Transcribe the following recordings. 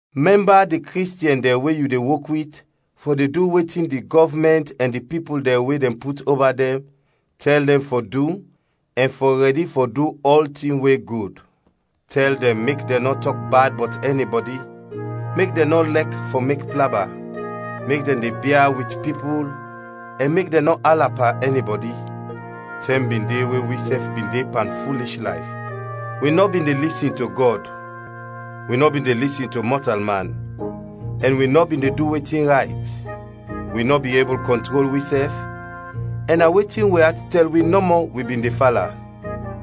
Mɛmba di Kristiɛn dɛn we yu de wok wit fɔ de du wetin di gɔvmɛnt ɛn di pipul dɛn we dɛn put oba dɛn, tɛl dɛn fɔ du ɛn fɔ rɛdi fɔ du ɔltin we gud. Tɛl dɛn mek dɛn nɔ tɔk bad bɔt ɛnibɔdi, mek dɛn nɔ lɛk fɔ mek plaba, mek dɛn de bia wit pipul ɛn mek dɛn nɔ ala pan ɛnibɔdi. Tɛm bin de we wisɛf bin de pan fulish layf, wi nɔ bin de lisin to Gɔd, wi nɔ bin de lisin to mɔtalman, ɛn wi nɔ bin de du wetin rayt. Wi nɔ bin ebul kɔntrol wisɛf, ɛn na wetin wi at tɛl wi nɔmɔ wi bin de fala;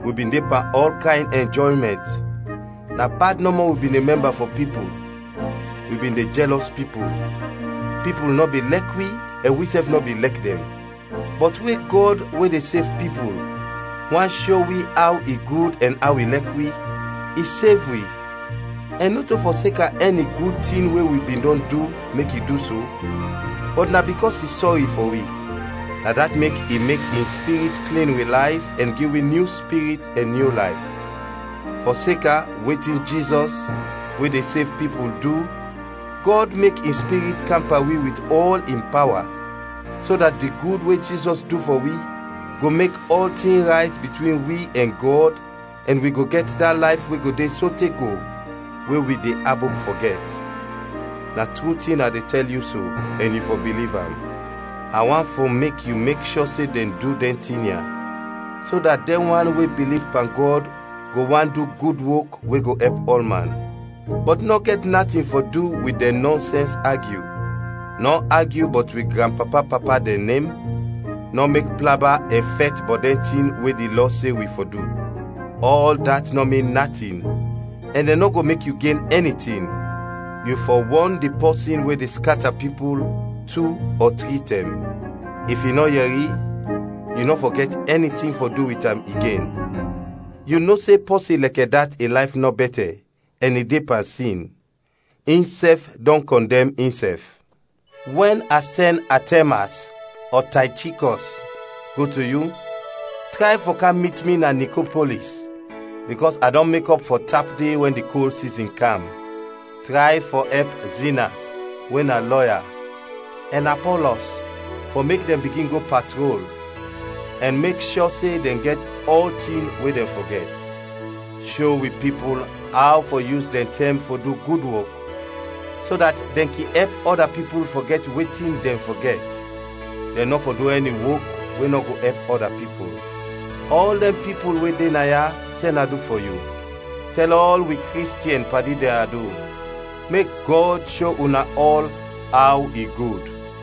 wi bin de pan ɔl kayn ɛnjɔymɛnt, na bad nɔmɔ wi bin de mɛmba fɔ pipul, wi bin de jɛlɔs pipul, pipul nɔ bin lɛk wi ɛn wisɛf nɔ bin lɛk dɛn. Bɔt we Gɔd, we de sev pipul, want sho wi aw i gud ɛn aw i lɛk wi, i sev wi; ɛn nɔto fɔseka ɛni gud tin we wi bin dɔn du mek i du so, bɔt na bikɔs i sɔri fɔ wi, na dat mek i mek in Spirit klin wi layf ɛn gi wi nyu spirit ɛn nyu layf. Fɔseka wetin Jizɔs, we de sev pipul, du, Gɔd mek in Spirit kam pan wi wit ɔl in pawa, so dat di gud we Jizɔs du fɔ wi, go mek ɔltin rayt bitwin wi ɛn Gɔd ɛn wi go gɛt da layf we go de sote go we wi de abop fɔ gɛt. Na tru tin a de tɛl yu so, ɛn yu fɔ biliv am. A want fɔ mek yu mek shɔ se dɛn du dɛn tin ya, so dat dɛn wan we biliv pan Gɔd go want du gud wok we go ɛp ɔlman. Bɔt nɔ gɛt natin fɔ du wit dɛn nɔnsɛns agyu, nɔ agyu bɔt wi granpapa-papa dɛn nem, nɔ mek plaba ɛn fɛt bɔt dɛn tin we di Lɔ se wi fɔ du. Ɔl dat nɔ min natin ɛn dɛn nɔ go mek yu gen ɛni tin. Yu fɔ wɔn di pɔsin we de skata pipul, tu ɔ tri tɛm; if i nɔ yɛri, yu nɔ fɔ gɛt ɛni tin fɔ du wit am igen. Yu no se pɔsin lɛkɛ dat in layf nɔ bɛtɛ, ɛn i de pan sin; insɛf dɔn kɔndɛm insɛf. Wɛn a sɛn Atɛmas ɔ Taychikɔs go to yu, tray fɔ kam mit mi na Nikopolis, bikɔs a dɔn mekɔp fɔ tap de wɛn di kol sizin kam. Tray fɔ ɛp Zinas, we na lɔya, ɛn Apɔlɔs fɔ mek dɛn bigin go patrol, ɛn mek shɔ se dɛn gɛt ɔltin we dɛn fɔ gɛt. Sho wi pipul aw fɔ yus dɛn tɛm fɔ du gud wok, so dat dɛn kin ɛp ɔda pipul fɔ gɛt wetin dɛn fɔ gɛt; dɛn nɔ fɔ du ɛni wok we nɔ go ɛp ɔda pipul. Ɔl dɛn pipul we de naya, sɛn adu fɔ yu. Tɛl ɔl wi Kristiɛn padi dɛn adu. Mek Gɔd sho una ɔl aw i gud.